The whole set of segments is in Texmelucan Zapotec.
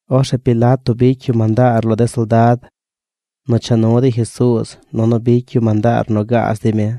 Orzeꞌ Pilato bicy yu mandaar lo de soldad nu cha nu dey Jesuuz nunu bicy yu mandaar nu gaaz dey mi.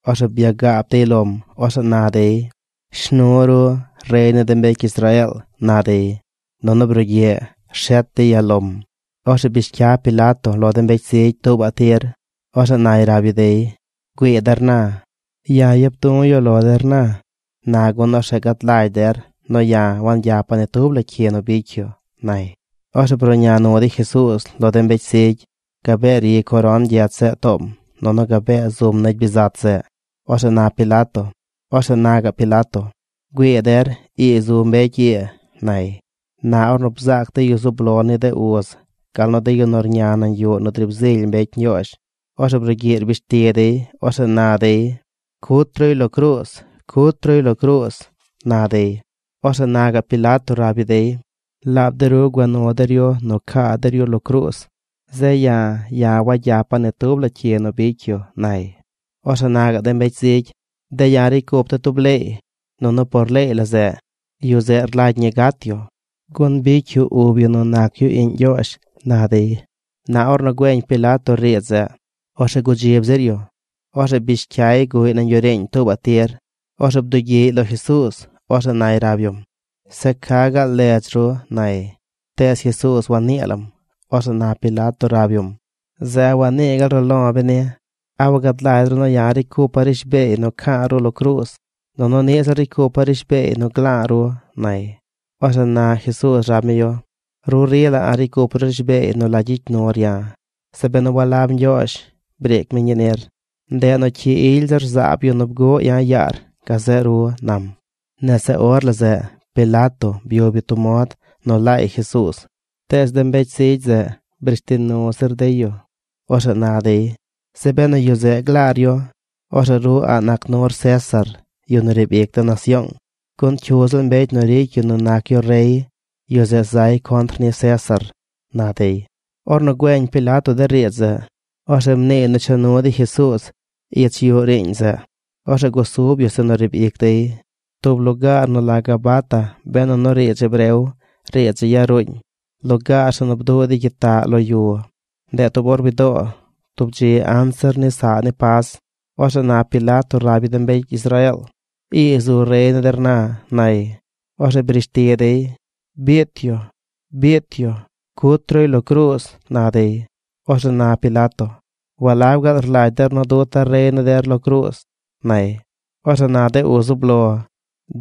Orzeꞌ byagaab dey lom. Orzeꞌ na dey: ―¡Shnu ru, rey ni de mbecy Israeel! ―na dey. Nunu brugyiꞌ rshet dey yalom. Orzeꞌ bish cya Pilato lo de mbecy zigy tuubaꞌ tir. Orzeꞌ nay rab yu dey: ―Güii der na, ya̱ yap du̱ yu lo der na gun orzeꞌ gad lagy der nu ya̱ wagyapa̱ ni tub la cyi nu bicy yu ―nay. Orzeꞌ bruꞌña nu dey Jesuuz lo de mbecy zigy. Gabee ri coron gyech zeꞌ toom nunu gabee zum negy bizat zeꞌ. Orzeꞌ na gaꞌ Pilato: ―¡Güii der, ii zu mbecy ii! ―nay. Na ornu bzaac de yu zub lo ni de uz gal nu de yu nu rña nañ yuꞌ nu driib zily mbecy Ñgyoozh, orzeꞌ brugyiꞌ rbish ti dey. Orzeꞌ na dey: ―¡Cut ruy lo cruuz! ¡Cut ruy lo cruuz! ―na dey. Orzeꞌ na gaꞌ Pilato rab yu dey: ―Laab de ru gua nu der yu nu caa der yu lo cruuz. Zeꞌ ya̱, ya̱ wagyapa̱ ni tub la cyi nu bicy yu ―nay. Orzeꞌ na gaꞌ de mbecy zigy: ―De̱ ya̱ ricy cup de̱ tub leey. Nunu por leey la zeꞌ, yu zeꞌ rlagy ñi gat yu, gun bicy yu ub yu nu nac yu iꞌñ Ñgyoozh ―na dey. Na ornu güeñ Pilato riidz zeꞌ, orzeꞌ gudzib zir yu. Orzeꞌ bish cyay guꞌy nañ yuꞌ riiñ tuubaꞌ tir. Orzeꞌ bdugyiꞌy lo Jesuuz. Orzeꞌ nay rab yum: ―Zeꞌ ¿ca gaal ledz ru? ―nay. Tees Jesuuz wannii lam. Orzeꞌ na Pilato rab yum: ―Zeꞌ ¿a wanii gaal ru lo̱ beni? ¿A wagad lagy ru nu ya̱ ricy cupa̱ rishbeey nu ca̱a̱ ru lo cruuz? Nunu niꞌ ziꞌl ricy cupa̱ rishbeey nu gla̱a̱ ru ―nay. Orzeꞌ na Jesuuz rab mi yu: ―Ru rila a̱ꞌ ricy cup ru rishbeey nu la gyicy nur ya̱ zeꞌ benu walab Ñgyoozh briic mi ñii nir. Ndeꞌ nu cyi ily zir zaab yu nu bguꞌ ya̱ yaar gazeꞌ ru ―nam. Nese or la zeꞌ Pilato byub yu tub mod nu laay Jesuuz. Tees de mbecy zigy zeꞌ brish ti nu zir dey yu. Orzeꞌ na dey: ―¡Zeꞌ benu yu zeꞌ glaar yu, orzeꞌ ru a̱ꞌ nac nur César, yu nu riib ic de nasyoong! ¡Gun cyu ziꞌl mbecy nu ricy yu nu nac yu rey, yu zeꞌ zay contr ni César! ―na dey. Ornu güeñ Pilato de riidz zeꞌ, orzeꞌ mniiy nu cha nu dey Jesuuz ich yuꞌ riiñ zeꞌ. Orzeꞌ gusub yu zeꞌ nu riib ic dey, tub lugaar nu la Gabata benu nu riidz hebreo. Riidz zeꞌ yaruuñ: Lugaar zeꞌ nu bduꞌ dey gyitaꞌ lo yu. Ndeꞌ tub or widoo tub dzi anzir ni saꞌ ni Pas. Orzeꞌ na Pilato rab yu de mbecy Israeel: ―¡Ii zu rey ni der na! ―nay. Orzeꞌ brish ti dey: ―¡Biit yu! ¡Biit yu! ¡Cut ruy lo cruuz! ―na dey. Orzeꞌ na Pilato: ―¿Walab gaal rlagy der nu duta̱ rey ni der lo cruuz? ―nay. Orzeꞌ na de uz zub lo: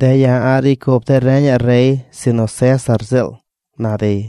―¡De̱ ya̱ a̱ꞌ ricy cup de̱ renaꞌ rey sinu César ziꞌl! ―na dey.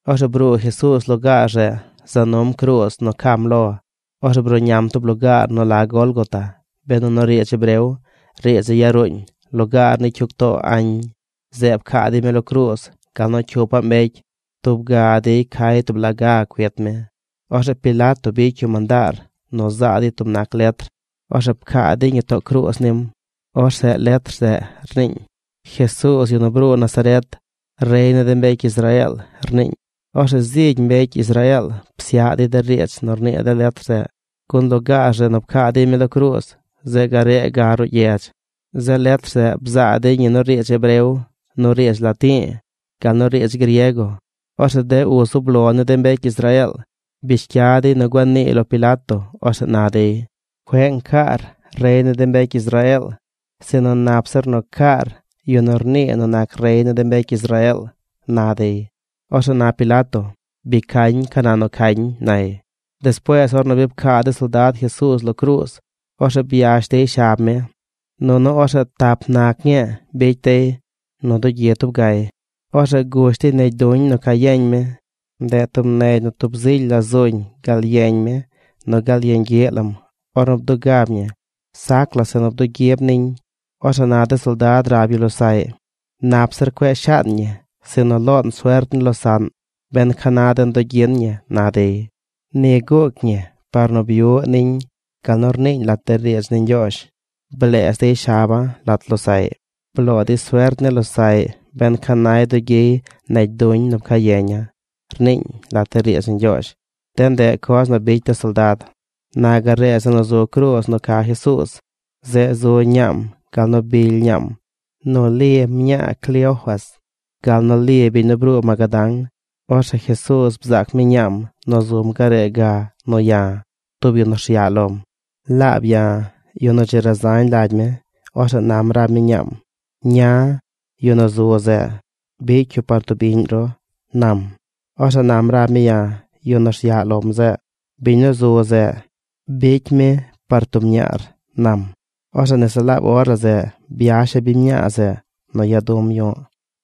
Orzeꞌ bruu Jesuuz lugaar zeꞌ za num cruuz nu cam lo. Orzeꞌ bruꞌñam tub lugaar nu la Gólgota benu nu riidz hebreo. Riidz zeꞌ yaruuñ: Lugaar ni cyug too añ. Zeꞌ pcaa dey mi lo cruuz gal nu cyupaꞌ mbecy. Tub ga dey cay tub laꞌ gaꞌ cuit mi. Orzeꞌ Pilato bicy yu mandaar nu zaa dey tub nac letr. Orzeꞌ pcaa dey ñi too cruuz nim. Orzeꞌ letr zeꞌ rniiñ: “Jesuuz, yu nu bruu Nazaret, rey ni de mbecy Israeel”, rniiñ. Orzeꞌ zigy mbecy Israeel psyaꞌ dey de riidz nu rnii de letr zeꞌ gun lugaar zeꞌ nu pcaa dey mi lo cruuz zeꞌ garee ga ruꞌ gyedz. Zeꞌ letr zeꞌ bzaa dey ñi nu riidz hebreo, nu riidz lati̱i̱, gal nu riidz griego. Orzeꞌ de uz zub lo ni de mbecy Israeel, bish cya dey nu gua niiy lo Pilato. Orzeꞌ na dey: ―Cueꞌ ncaar “Rey ni de mbecy Israeel”, sinu nap zir nu caar “Yu nu rnii nu nac rey ni de mbecy Israeel” ―na dey. Orzeꞌ na Pilato: ―Bi cañ ca nu nu cañ ―nay. Despuees ornu bi pcaa de soldad Jesuuz lo cruuz, orzeꞌ byash dey shab mi, nunu orzeꞌ tap nac ñii bicy dey nu dugyi tub gay. Orzeꞌ gush dey negy duñ nu ca yeñ mi. Ndeꞌ tub negy nu tub zily la zuñ gal yeñ mi nu gal yeñ gyiꞌ lam ornu bdugab ñi. Sac la zeꞌ nu bdugyib niñ. Orzeꞌ na de soldad rab yu losaꞌy: ―Nap zir cueꞌ shaan ñi sinu loon suert ni losaꞌn ben ca na den dugyin ñi ―na dey. Ni guuc ñi par nu byuꞌ niñ gal nu rniiñ lat de riidz ni Ñgyoozh: “Bleez dey shaba̱ lat losaꞌy. Bloo dey suert ni losaꞌy ben ca nay dugyiy negy duñ nu pcaa yeña̱”, rniiñ lat riidz ni Ñgyoozh. De ndeꞌ coz nu bicy de soldad. Na garee zeꞌ nu zu cruuz nu ca Jesuuz, zeꞌ zu ñaam, gal nu bily ñaam, nu Li mñaa Cleofas, gal nu Li biñ nu bruu Magadán. Orzeꞌ Jesuuz bzaac mi ñaam nu zum garee ga nu ya̱, tub yu nu rsyaꞌ lom. Laab ya̱, yu nu dzi razañ lagy mi. Orzeꞌ nam rab mi ñaam: ―Ña, yu nu zu zeꞌ, bicy yu par tub iꞌñ ru ―nam. Orzeꞌ nam rab mi ya̱, yu nu rsyaꞌ lom zeꞌ: ―Biñ nu zu zeꞌ, bicy mi par tub ñaar ―nam. Orzeꞌ nese laab or la zeꞌ byasha̱ biñ mñaa zeꞌ nu ya du̱m yu̱ꞌ.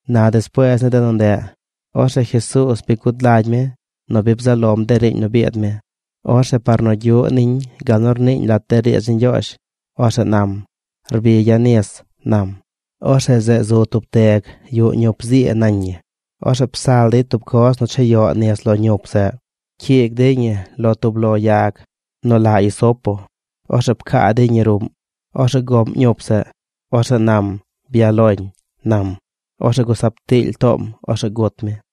Na despuees ni de nu ndeꞌ, orzeꞌ Jesuuz bi gud lagy mi nu bi bzaꞌ lom de riiñ nu biid mi. Orzeꞌ par nu gyuꞌ niñ gal nu rniiñ lat de riidz ni Ñgyoozh, orzeꞌ nam: ―Rbigya̱ nis ―nam. Orzeꞌ zeꞌ zu tub teg yuꞌ ñup zii nañ ñi. Orzeꞌ psal dey tub coz nu chayoꞌ nis lo ñup zeꞌ. Pcyiig dey ñi lo tub lo yag nu la hisopo. Orzeꞌ pcaa dey ñi ruꞌm. Orzeꞌ goꞌm ñup zeꞌ. Orzeꞌ nam: ―Byaꞌ loñ ―nam. Orzeꞌ gusab tiily toom. Orzeꞌ gut mi.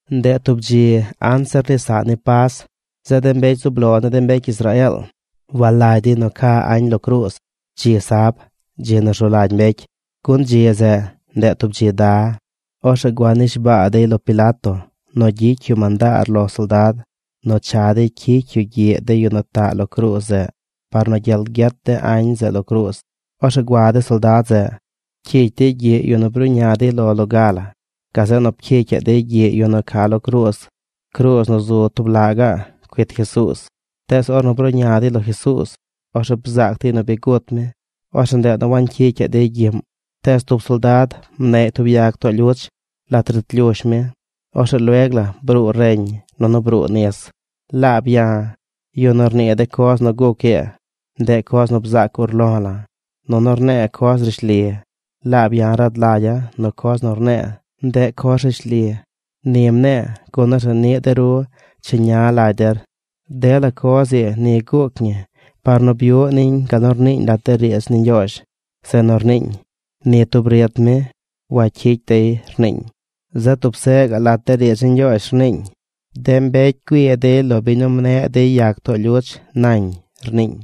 Ndeꞌ tub dzi anzir ni saꞌ ni Pas. Zeꞌ de mbecy zub lo ni de mbecy Israeel walagy dey ca añ lo cruuz dzi sab, dzi nu rzu lagy mbecy, gun dzi zeꞌ, ndeꞌ tub dzi da. Orzeꞌ gua nishbaa dey lo Pilato nu gyicy yu mandaar lo soldad nu cha dey cyicy yu gyiꞌ de yu nu taꞌ lo cruuz zeꞌ par nu gyel gyet de añ zeꞌ lo cruuz. Orzeꞌ gua de soldad zeꞌ. Pcyicy dey gyiꞌ yu nu bruꞌña dey lo loga la. Gazeꞌ nu pcyicyaꞌ dey gyiꞌ yu nu ca lo cruuz, cruuz nu zu tub laꞌ gaꞌ cuit Jesuuz. Tees ornu bruꞌña dey lo Jesuuz, orzeꞌ bzaac dey nu bi gut mi. Orzeꞌ ndeꞌ nu wancyicyaꞌ dey gyiꞌm. Tees tub de soldad mneꞌy tub yag too lyuch lat rit lyush mi. Orzeꞌ lueg la bruu reñ nunu bruu nis. Laab ya̱, yu nu rnii de coz nu guc ii, ndeꞌ coz nu bzaac urlo̱ la̱. Nunu rne̱e̱ coz rishli. Laab ya̱ rad lagya̱ nu coz nu rne̱e̱, ndeꞌ coz rishli. Ni mne̱e̱ gun orzeꞌ niꞌ de ru cheña lagy der. Dela coz ii ni guuc ñi par nu byuꞌ niñ gal nu rniiñ lat de riidz ni Ñgyoozh zeꞌ nu rniiñ: “Ni tub rit mi wacyicy dey”, rniiñ. Zeꞌ tub seꞌ gaꞌ lat riidz ni Ñgyoozh rniiñ: “De mbecy güii dey lo biñ nu mneꞌ dey yag too lyuch nañ”, rniiñ.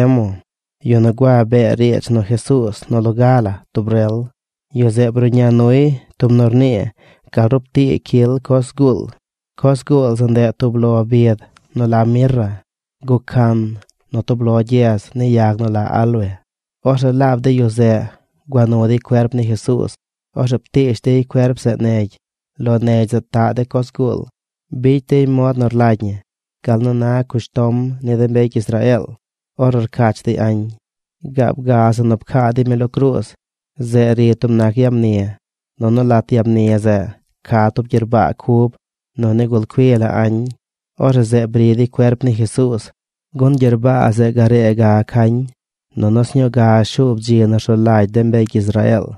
Orzeꞌ Nicodemo, yu nu gua bee riidz nu Jesuuz nu loga la tub rel, yu zeꞌ bruꞌña nuy tub nu rnii gal rup tii cyil coz zguul. Coz zguul zeꞌ ndeꞌ tub lo bid nu la mirra guꞌ can nu tub lo gyez ni yag nu la áloe. Orzeꞌ laab de yu zeꞌ gua nu dey cuerp ni Jesuuz. Orzeꞌ ptiish dey cuerp zeꞌ negy. Lo negy zeꞌ taꞌ de coz zguul. Bicy dey mod nu rlagy ñi gal nu na cushtom ni de mbecy Israeel ornu rcach dey añ. Gaab ga zeꞌ nu pcaa dey mi lo cruuz, zeꞌ ri tub nac yag mni. Nunu lat yag mni zeꞌ ca tub gyerbaa cub nu nigul cui la añ. Orzeꞌ zeꞌ bri dey cuerp ni Jesuuz, gun gyerbaa zeꞌ garee ga cañ nunu sñuu ga shuub dzi nu rzu lagy de mbecy Israeel.